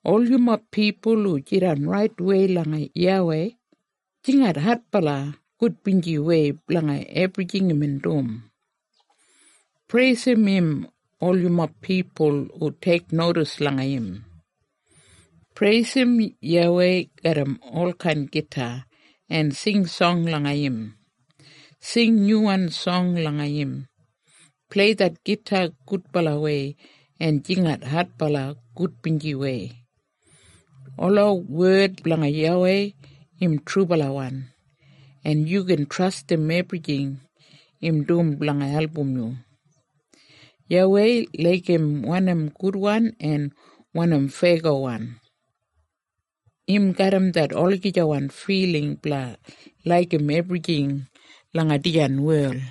Ol yumob pipul hu jidan raitwei langa YAWEI, jingat adbala gudbinjiwei blanga ebrijing imbin dum. Preisim im ol yumob pipul hu teiknodis langa im. Preisim YAWEI garram ol kain gita, en sing song langa im. Sing nyuwan song langa im. Plei det gita gudbalawei en jingat adbala gudbinjiwei. Ola wed blanga YAWEI im trubalawan, en yu gin trastim ebrijing im dum blanga album yu. YAWEI laigim wanim gudwan en wanim feyagowan. Im garram det olagijawan filing blanga laigim ebrijing langa dijan wel.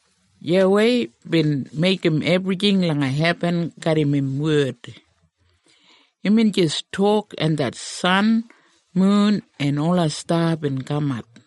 YAWEI bin meigim ebrijing langa hebin garram im wed. Imbin jis tok en det san, mun, en ola sta bin kamat.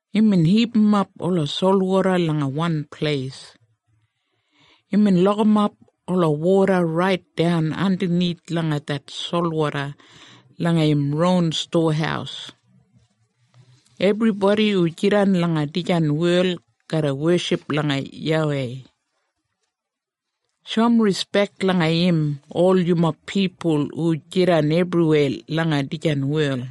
Imbin hipimap ola solwoda langa wan pleis. Imbin lokimap ola woda raitdan andanith langa det solwoda langa im ron stowahaus. Ebribodi hu jidan langa dijan wel garra weship langa YAWEI. Shoum rispek langa im ol yumob pipul hu jidan ebriweya langa dijan wel.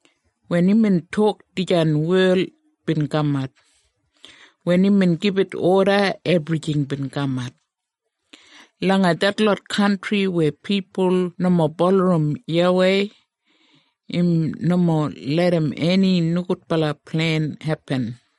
Wen imbin tok dijan wel bin kamat. Wen imbin gibit oda ebrijing bin kamat. Langa detlot kantri weya pipul nomo bulurrum YAWEI, im nomo larram eni nogudbala plen hepin.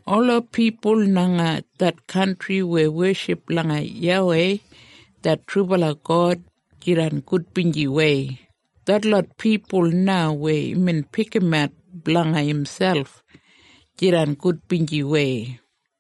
Ola pipul langa det kantri weya weship langa YAWEI det trubala God, jidan gudbinjiwei, detlot pipul na weya imbin pikimat blanga imselp, jidan gudbinjiwei.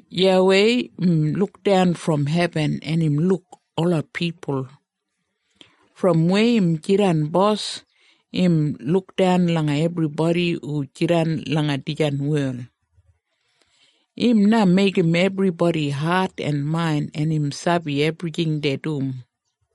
YAWEI im lukdan brom hebin en im luk ola pipul. Brom weya im jidan bos, im lukdan langa ebribodi hu jidan langa dijan wel. Im na meigim ebribodi hat en main, en im sabi ebrijing dei dum.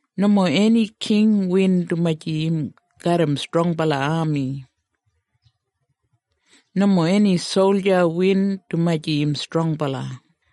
Nomo eni king win dumaji im garram strongbala ami. Nomo eni solja win dumaji im strongbala.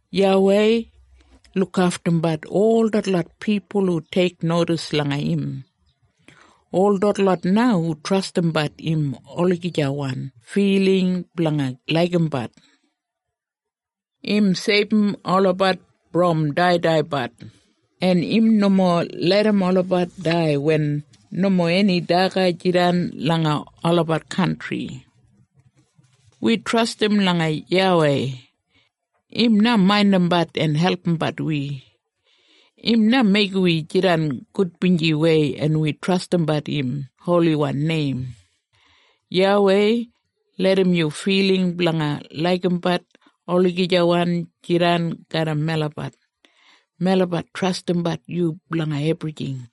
YAWEI lukaftumbat ol detlot pipul hu teiknodis langa im, ol detlot na hu trastimbat im olagijawan filing blanga laigimbat. Im seibum olabat brom daidaibat, en im nomo larram olabat dai wen nomo eni daga jidan langa olabat kantri. Wi trastim langa YAWEI. Im na maindimbat en albumbat wi. Im na meigim wi jidan gudbinjiwei, en wi trastimbat im holiwan neim. YAWEI, larram yu filing blanga laigimbat olagijawan jidan garram melabat. Melabat trastimbat yu blanga ebrijing.